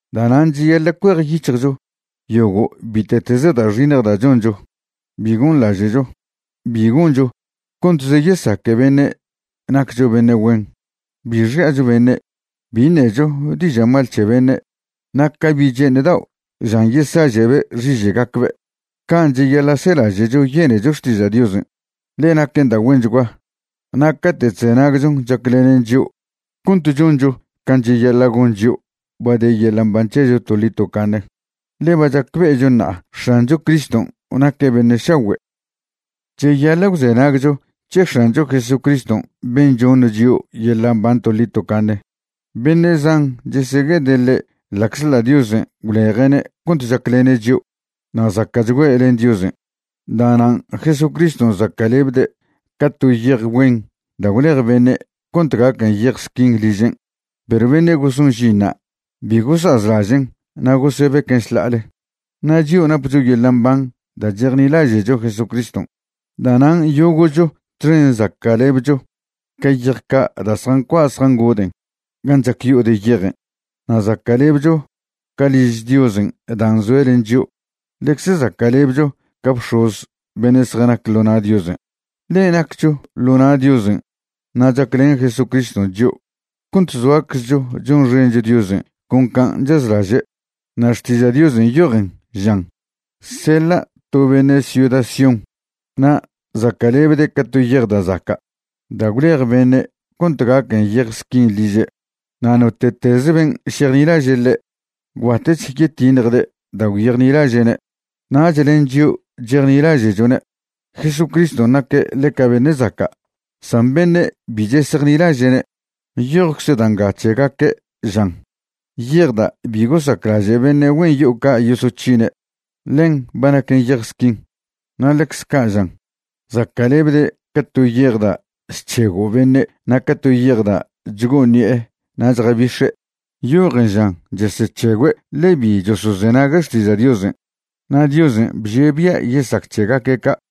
Da'nan' cheyaḻa' cuejyic̱hjcho yogo' bite'teze da' xiṉj da' choncho. Bi gonḻaže'cho, bi goncho contze yesaque beṉe' naccho beṉe' güen, bi xi'acho beṉe', bi ṉecho diža' mal c̱he beṉe'. Na' ca bi' che'eṉ dao' žan yesaže'be' xiže'gacbe', can' cheyaḻa' selaže'cho yenecho xtiža' Diosen', ḻe naquen da' güenchgua, na' cate' chzenagchon chaclenen chio' cont choncho can' cheyaḻa' gon chio' ba de yeḻa' mban c̱hecho toḻi tocaṉe. Ḻe ba chacbe'echo ṉa'a X̱ancho Criston' naque' beṉe' šagüe'. Cheyaḻa' gwzenagcho c̱he X̱ancho Jesucriston' ben' choṉ chio' yeḻa' mban toḻi tocaṉe. Beṉe' zan chesegue'ede' ḻe' ḻa'czḻa' Diosen' gwleje'ne' cont chaclene' chio' na' zaca'chgüe' len Diosen'. Da'nan' Jesucriston' zaca'lebde' ca to yej güen da' gwlej beṉe' cont gaquen yej squin ližen', perw beṉe' goson žinṉa' bi gosazlažen' na' gosebequen' šḻa'ale. Na' chio' napcho yeḻa' mban da' chejnilaže'cho Jesucriston'. Da'nan' yogo'cho txen zaca'lebcho ca yej ca' da' zjancua' zjangoden' gan' chac yo'o de yejen'. Na' zaca'lebcho ca' liž Diosen' dan' zoe' len chio'. Ḻecze zaca'lebcho ca bx̱oz beṉe' zjanac ḻo na' Diosen', ḻe naccho ḻo na' Diosen' na' chaclen Jesucriston' chio' cont zoaczcho chonxencho Diosen' con can' chazlaže'. Na' Xtiža' Diosen' nyojen, žan: Seḻa' to beṉe' ciuda Sión na' zaca'lebde' ca to yej da' zaca' da' gwlej beṉe' cont gaquen yej squin liže'. Na' note'teze ben' šejnilaže' ḻe', gwbatech yetiṉjde' da' gwyejnilaže'ne'. Nach len chio' chejnilaže'chone', Jesucriston' naque' ḻeca beṉe' zaca'. San beṉe' bi chesejnilaže'ne', nyojcze da' nga c̱hegaque', žan: Yej da' bi gosaclaže' beṉe' güen yo'o ca' yosoc̱hine', ḻen ba naquen yej squin. Na' ḻecze ca' žan: Zaca'lebde' ca to yej da' chc̱hego' beṉe' na' ca to yej da' chgo'o ṉi'e na' chjasebix̱e'. Nyojen žan chesec̱hegüe' ḻe bi chosozenague' xtiža' Diosen'; na' Diosen' bžie' bia' yesac c̱hegaque' ca'.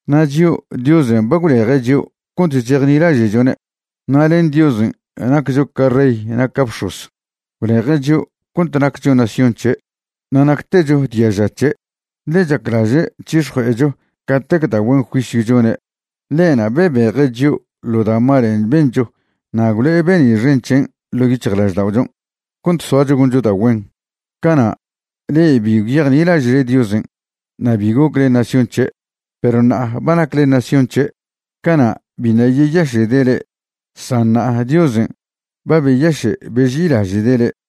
Na' chio', Diosen' ba gwleje' chio' cont chejnilaže'chone'. Na' len Diosen' naccho ca rey na' ca bx̱oz. Gwleje' chio' cont naccho nación c̱he', na' nactecho diaža' c̱he', ḻe chaclaže' c̱hix̱jue'echo catec da' güen juisyw chone'. Ḻe'na' bebeje' chio' ḻo da' malen' bencho na' gwlo'e be'ni' xen c̱hen' ḻo' yic̱hjlažda'ochon' cont soacho goncho da' güen. Cana' le'e bi gwyejnilaže'le Diosen' na' bi gocle nación c̱he', perw ṉa'a ba nacle nación c̱he'. Cana' biṉa' yeyaše'de' le'e, san ṉa'a Diosen' ba beyaše' beži'ilaže'de' le'e.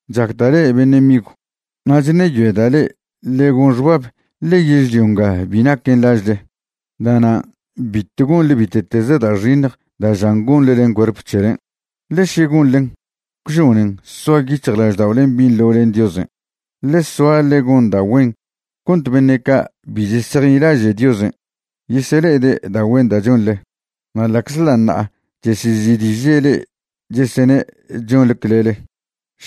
Chacda' le'e beṉe' migw, na' chṉeyoeda' le'e ḻe gon xbab ḻe yežlio nga bi naquen lažle. Da'nan' bitw gonḻe bite'teze da' xiṉj da' žan gonḻe len cuerp c̱helen', ḻe še gonḻen, gwžonen soa yic̱hjlažda'olen' binḻo len Diosen'. Ḻe soa ḻe gon da' güen cont beṉe' ca' bi chesejnilaže' Diosen' yesele'ede' da' güen da' chonḻe, na' ḻa'czḻa' ṉa'a chesezi'diže' le'e chesene' chonḻe clele,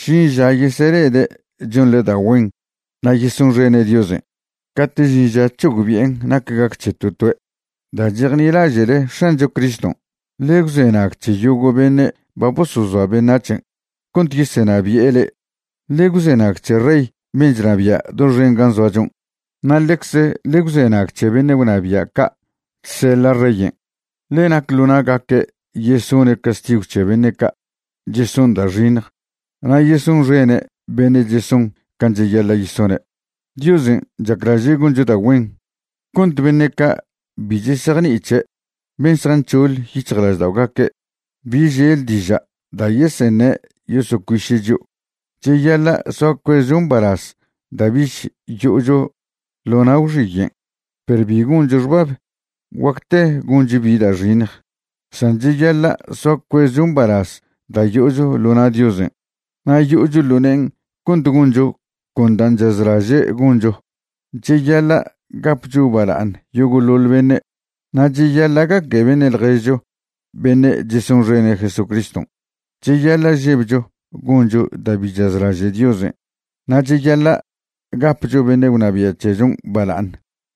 žin ža yesele'ede' chonḻe da' güen na' yesonxene' Diosen' cate' žin ža c̱hogbi'en nac gac c̱he to toe'. Da' chejnilaže'le X̱ancho Criston', ḻe gwzenag c̱he yogo' beṉe' ba bosozoa beṉac̱hen' cont yeseṉabi'e le'e. Ḻe gwzenag c̱he rey ben' chnabia' doxen gan' zoachon', na' ḻecze ḻe gwzenag c̱he beṉe' gwnabia' ca' chseḻa' reyen'. Ḻe nac ḻo na'gaque' yesone' castigw c̱he beṉe' ca' cheson da' xiṉj na' yesonxene' beṉe' cheson can' cheyaḻa' yesone'. Diosen' chaclaže' goncho da' güen cont beṉe' ca' bi chesejni'i c̱he', ben' zjanc̱hoḻ yic̱hjlažda'ogaque', bi žel diža' da' yeseṉe' yosocuiše' chio'. Cheyaḻa' soa cuezcho mbalaz da' bich yo'ocho ḻo na' gwxiyen', perw bi goncho xbab guacte goncho bi da' xiṉj. San cheyaḻa' soa cuezcho mbalaz da' yo'ocho ḻo na' Diosen', na' yo'ocho ḻo ne'en cont goncho con dan' chazlaže' goncho. Cheyaḻa' gapcho bala'aṉ yogo'ḻoḻ beṉe'. Na' cheyaḻa' gaque beṉe' ḻježcho beṉe' chesonxene' Jesucriston'. Cheyaḻa' žebcho goncho da' bi chazlaže' Diosen'. Na' cheyaḻa' gapcho beṉe' gwnabia' c̱hechon' bala'aṉ.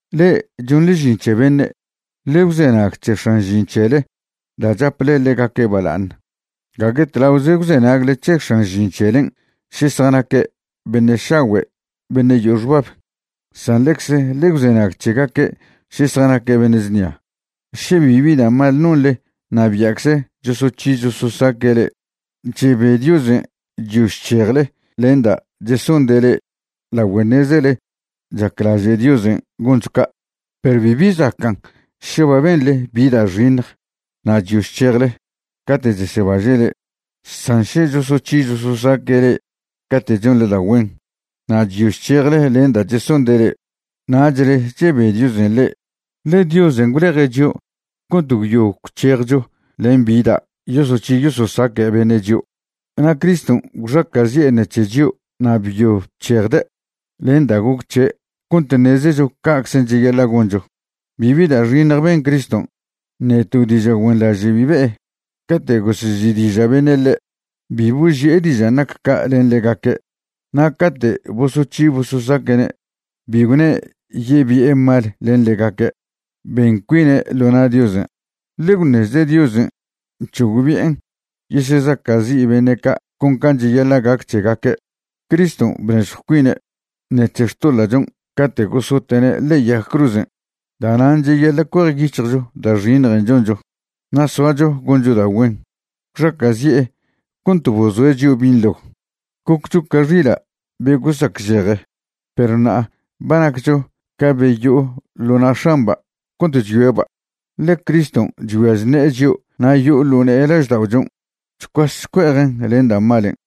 Le'e chonḻe žin c̱he beṉe', ḻe gwzenag c̱he x̱an žin c̱hele da' chaple ḻegaque' bala'aṉ. Gague tlaoze gwzenagle c̱he x̱an žin c̱helen' še zjanaque' beṉe' šagüe' beṉe' yo'o xbab, san ḻecze ḻe gwzenag c̱hegaque' še zjanaque' beṉe' znia. Še bibi da' mal nonḻe na' bia'cze chosoc̱hi chososaque' le'e, chebe Diosen' chyo chc̱hejle len da' chesonde' le'e lagüe ṉezele chaclaže' Diosen' goncho ca'. Perw bibi zacan' še ba benḻe bi da' xiṉj na' chyo chc̱hejle cate' chesebaže' le'e. San še chosoc̱hi chososaque' le'e cate' chonḻe da' güen na' chyo chc̱hejle len da' chesonde' le'e, nachle chebe Diosen' le'e. Ḻe Diosen' gwleje' chio' cont gwyo gwc̱hejcho len bi da' yosoc̱hi yososaca' beṉe' chio', na' Criston' gwxaca'zi'e ṉec̱he chio' na' byo bc̱hejde' len da' goc c̱he' cont ṉezecho ca'czen' cheyaḻa' goncho. Bibi da' xiṉj ben Criston', ṉe to diža' güenḻaže' bi be'e. Cate' gosezi'diža' beṉe' ḻe', bi boži'e dižan' nac ca' len ḻegaque'. Na' cate' bosoc̱hi bososaque'ne', bi gwne' yebi'e mal len ḻegaque'. Ben cuine' ḻo na' Diosen', ḻe gwṉezde' Diosen' c̱hogbi'en yesezaca'zi' beṉe' ca' con can' cheyaḻa' gac c̱hegaque'. Criston' bnežjw cuine' ṉec̱he xtoḻa'chon' cate' gosote'ne' ḻe'e yag cruzen'. Da'nan' cheyaḻa' cuejyic̱hjcho da' xiṉjen' choncho na' soacho goncho da' güen. Gwxaca'zi'e cont bozoe' chio' binḻo. Goccho ca xila' be gosacžeje, perw ṉa'a ba naccho ca be yo'o ḻo na' x̱amba' cont chyoeba', ḻe Criston' chgüia chṉe'e chio' na' yo'o ḻo ne'e lažda'ochon' chcuas chcue'ejen' len da' malen'.